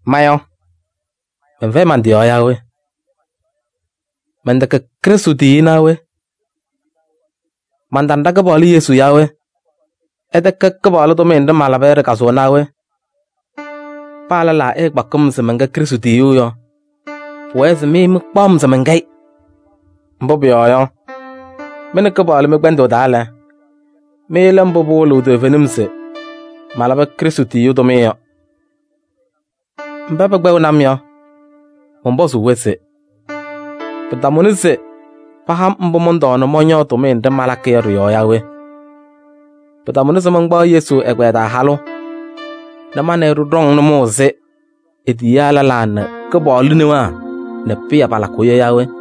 Ma yɔ, mɛnfɛyɩ man-tɩ yɔɔ yaa we? Mɛntɛkɛ Krɩstʋ tiyiyu naa we? Mantana ɖa-Kɩpaɣlʋ Yesu yaa we? Ɩtɛkɛ Kɩpaɣlʋ tʋmɩyɛ nɖɩ malaba yɔ ɖɩ-kazʋwa naa we? Paa lɛlaa ɛtakpaɣ-m se mɛnkɛ Krɩstʋ tiyiyu yɔ, pʋwɛɛ se mɩ mɩkpaɣ-m se mɛnkɛ-ɩ. Mbʋ pʋyɔɔ yɔ, mɩ nɛ Kɩpaɣlʋ mɩ-kpɛndʋʋ taa lɛ, mɩ lɛ mbʋ pɩwɩlɩɣ toovenim se malabɩ Krɩstʋ tiyiyu tʋmɩyɛ yɔ. Mba pɛkpɛɣnɩ-m yɔ, mɔnpɔzʋʋ-wɛ se: pɩtamʋnɩ se ɩha-m mbʋ mɔntɔɔ nɛ mɔñɔɔ tʋmɩyɛ nɖɩ malakɩ yɔ ɖɩ-yɔɔ yaa we? Pɩtamʋnɩ se mankpaɣ Yesu ɛgbɛyɛ taa halʋ nɛ ma nɛ ɩ ɖɩɖɔŋ nʋmɔʋ ɛzɩ e-tiyiyaa lɛlaa nɛ Kɩpaɣlʋ newaa nɛ Pɩyɛ palakʋʋ yɔ yaa we?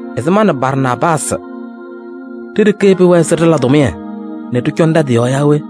Ɛzɩ ma nɛ Barnaabaasɩ ɖe-ɖeke pɩwɛnɩ se ɖɩla tʋmɩyɛ nɛ ɖɩcɔnɩ ɖa-tɩ yɔɔ yaa we?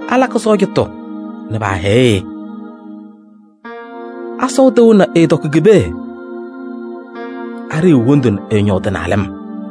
Alakɩ sɔɔjatʋ nɛ paahɛyɩɣ-ɩ? Asɔʋ tɩʋ nɛ ɛɛtɔkɩ ki-pee? Aɖiyiɣ wondu nɛ ɛɛñɔʋ tɩ-naalɩm?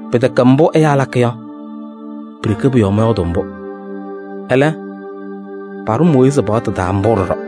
Pɩtɛkɛ mbʋ ɛyaa lakɩ yɔ, pi-ɖeke pʋ-yɔɔ mɔyɔɔdʋʋ mbʋ. Ɛlɛ, paɖʋ Mooyiizi paɣtʋ taa mbʋ ɖɔɖɔ.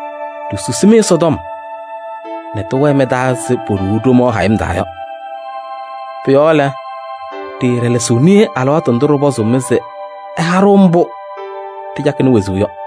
Ɖisusi-mɩ Ɛsɔtɔm nɛ tɩwɛɛ mɩ-taa ɛzɩ poɖuu ɖomaɣ hayɩm taa yɔ. Pʋ-yɔɔ lɛ, ɖɩɩɖɛlɛsɩɣ niye alɩwaatʋ ndʋ ɖɩpɔzʋʋ-mɩ se ɩha-ɖʋ mbʋ ɖɩcakɩnɩ wezuu yɔ.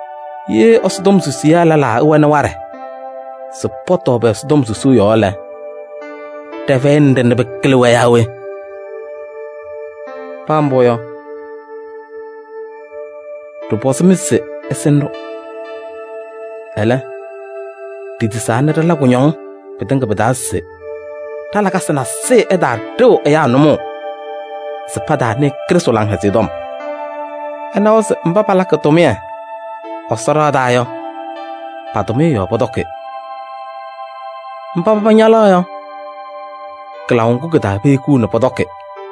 Ye Ɛsɔtɔm susiyaa lɛlaa ɛwɛnɩ waɖɛ se pɔtɔɔ pɛ-Ɛsɔtɔm susuu yɔɔ lɛ, ɖɩfɛyɩnɩ waɖɛ nɛ pɩkɩlɩ-wɛ yaa we? Paa mbʋ yɔ, ɖɩtɔpɔzɩ-mɩ se ɩsɩnɩ-ɖʋ. Ɛlɛ, ɖitisaa nɛ ɖɩla kʋñɔŋ pɩtɩŋa pɩ-taa se ɖa-lakasɩ nasɩyɩ ɛtaaɖɩɣ ɛyaa nʋmɔʋ se pataanɩɩ Krɩstʋ Laŋhɛzɩyɛ Tɔm. Ɩnawa se mba palakɩ Ɛsɔ ɖɩɣa taa tʋmɩyɛ yɔ, pa-tʋmɩyɛ yɔɔ pɔtɔkɩ. Mba paba ñalaɣ yɔ, kɩlaʋ ŋgʋ kɩ-taa pehikiɣ pɔtɔkɩ ɖɔɖɔ.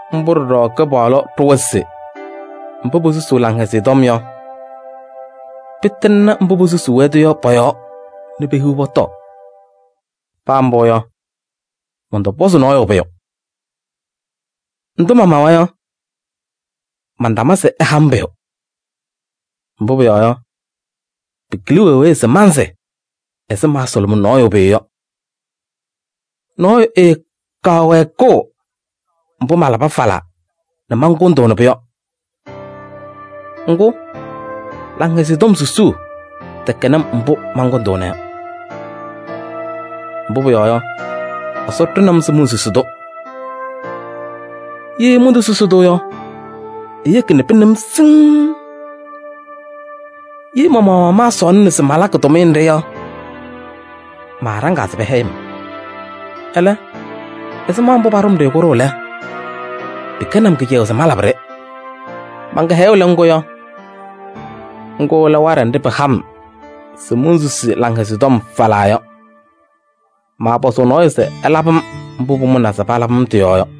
Mbʋ ɖɔɖɔ Kɩpaɣlʋ ɖʋwa se mba posusuu Laŋhɛzɩyɛ Tɔm yɔ, pɩtɩŋnɩ mba posusuu-wɛ-tʋ yɔ pɔ-yɔɔ nɛ pehiɣ pɔtɔɔ. Paa mbʋ yɔ, mɔntɔpɔzɩ nɔɔyʋ pʋyʋ. Ndʋ mamawa yɔ, mantama se ɩha-m pʋyʋ. Mbʋ pʋyɔɔ yɔ, pɩkɩlɩ wee wee se mansɩ ɛzɩ maasʋlʋmɩ nɔɔyʋ pʋyʋ yɔ: nɔɔyʋ ɛɛkaɣ wɛɛkʋʋ mbʋ malabɩ falaa nɛ mankʋndʋʋnɩ-pʋ yɔ. Ŋgʋ, Laŋhɛzɩyɛ Tɔm susuu tɛkɛnɩ-m mbʋ mankʋndʋʋna yɔ. Mbʋ pʋyɔɔ yɔ, Ɛsɔ ɖʋnɩ-m se monsusi-tʋ. Ye montosusi-tʋ yɔ, eyeki nɛ pɩnɩ-m siŋŋ. Ye ma-maɣmaɣ maasɔɔlɩna se malakɩ tʋmɩyɛ nɖɩ yɔ, maaɖaŋaa se pɛhɛyɩ-m. Ɛlɛ, ɛzɩma mbʋ paɖʋ-m-ɖɩ kʋɖʋʋ lɛ, pɩkɛnɩ-m kɩcɛyʋʋ se malabɩ-ɖɩ. Man-kɩhɛyʋʋ lɛ ŋgʋ yɔ? Ŋgʋ lɛ waɖɛ nɖɩ pɩha-m se monsusuu Laŋhɛzɩyɛ Tɔm falaa yɔ. Maapɔzʋʋ nɔɔyʋ se ɛlabɩ-m mbʋ pʋmʋnaa se palabɩ-m tɩ-yɔɔ yɔ.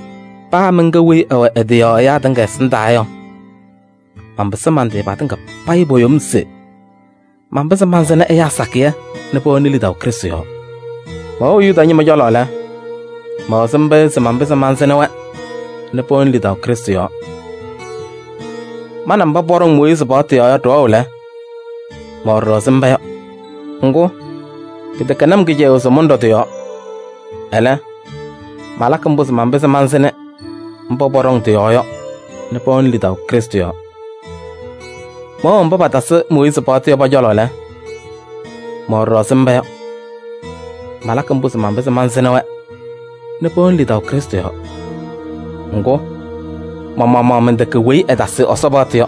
Paa mɛnkɛ weyi ɛwɛ ɛ-tɩ yɔɔ ɛyaa tɩŋa ɛsɩndaa yɔ, manpɩsɩ man-tɩ patɩŋa payɩ po-yom se manpɩzɩ mansɩnɩ ɛyaa sakɩyɛ nɛ pɛwɛnɩ lidaʋ Krɩstʋ yɔɔ. Mɛwɛɣ Yuda ñɩma cɔlɔ lɛ, mɛwɛ ɛzɩ mba yɔ se manpɩzɩ mansɩnɩ-wɛ nɛ pɛwɛnɩ lidaʋ Krɩstʋ yɔɔ. Ma nɛ mba pɔɖɔŋ Mooyiizi paɣtʋ yɔɔ yɔ ɖɩwɛɣ lɛ, mɛwɛ ɖɔɖɔ ɛzɩ mba yɔ. Ŋgʋ, pɩtɛkɛnɩ-m kɩcɛyʋʋ se mɔnɖɔ tɩ-yɔɔ. Ɛlɛ, malakɩ mbʋ se manpɩzɩ mansɩnɩ mba pɔɖɔŋ tɩ-yɔɔ yɔ nɛ pɛwɛnɩ lidaʋ Krɩstʋ yɔɔ. Mɛwɛɣ mba patasɩ Mooyiizi paɣtʋ yɔ pɔ-cɔlɔ lɛ, mɛwɛ ɖɔɖɔ ɛzɩ mba yɔ. Malakɩ mbʋ se manpɩzɩ mansɩnɩ-wɛ nɛ pɛwɛnɩ lidaʋ Krɩstʋ yɔɔ. Ŋgʋ, ma-maɣmaɣ mɛntɛkɛ weyi ɛtasɩ Ɛsɔ paɣtʋ yɔ.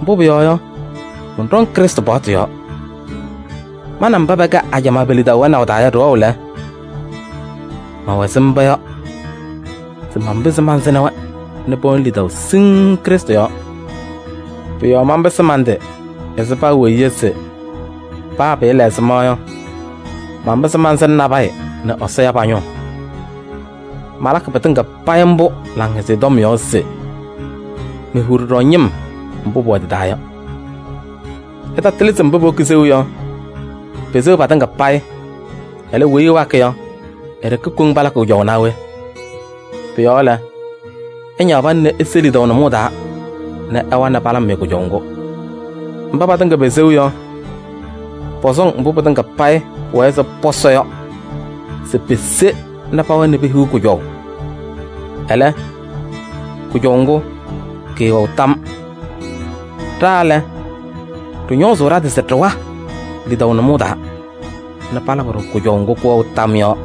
Mbʋ pʋyɔɔ yɔ, mɔnɖɔŋ Krɩstʋ paɣtʋ yɔɔ. Ma nɛ mba pɛkɛ ajamaa pe-lidaʋ wɛnaʋ taa yɔ ɖɩwɛɣ lɛ, mɛwɛ ɛzɩ mba ɖɔɖɔ yɔ se manpɩzɩ mansɩnɩ-wɛ nɛ pɛwɛnɩ lidaʋ siŋŋ Krɩstʋ yɔɔ. Pʋ-yɔɔ manpɩsɩ man-tɩ ɛzɩ paa weyi yɔ se paa pɩɩla ɛzɩma yɔ, manpɩzɩ mansɩnɩ nabɛyɛ nɛ Ɛsɔ ya pa-ñʋʋ. Malakɩ pɩtɩŋa payɩ mbʋ Laŋhɛzɩyɛ Tɔm yɔɔ se mehiɣ ɖɔɖɔ ñɩm mbʋ pʋwɛ tɩ-taa yɔ. Ɩtatɩlɩ se mba powoki seu yɔ, peseɣ patɩŋa payɩ, ɛlɛ, weyi ɛwakɩ yɔ e-ɖeke koŋ palakɩ kʋjɔʋ naa we? Pʋ-yɔɔ lɛ, ɩñaɣ pana nɛ ise lidaʋ nʋmɔʋ taa nɛ ɩwa nɛ palabɩ-mɩ kʋjɔʋ ŋgʋ. Mba patɩŋa peseɣ yɔ, pɔsɔŋ mbʋ pɩtɩŋa payɩ pʋwɛɛ se pɔsɔ yɔ se pese nɛ pawa nɛ pehiɣ kʋjɔʋ. Ɛlɛ, kʋjɔʋ ŋgʋ kɩɩwɛɣ tam. Ɖa lɛ, ɖɩñɔɔzʋʋ ɖa-tɩ se ɖɩwa lidaʋ nʋmɔʋ taa nɛ palabɩ-ɖʋ kʋjɔʋ ŋgʋ kɩwɛɣ tam yɔ.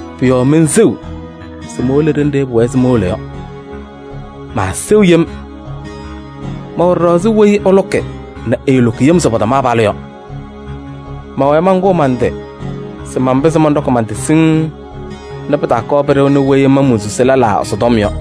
Pʋ-yɔɔ menseɣ se mowolo ɖenɖe pʋwɛɛ se mowolo yɔ, maaseɣ yem. Mɛwɛ ɖɔɖɔ ɛzɩ weyi ɛlʋkɩ nɛ ɛɛlʋkɩ yem se pɔtɔm se palʋ yɔ. Mɛwɛɛ mankʋʋ man-tɩ se manpɩzɩ mɔnɖɔkɩ man-tɩ siŋŋ nɛ pɩtaakɔɔ pɩɖɩɣnɩ weyi ma monsusi lɛlaa Ɛsɔtɔm yɔ.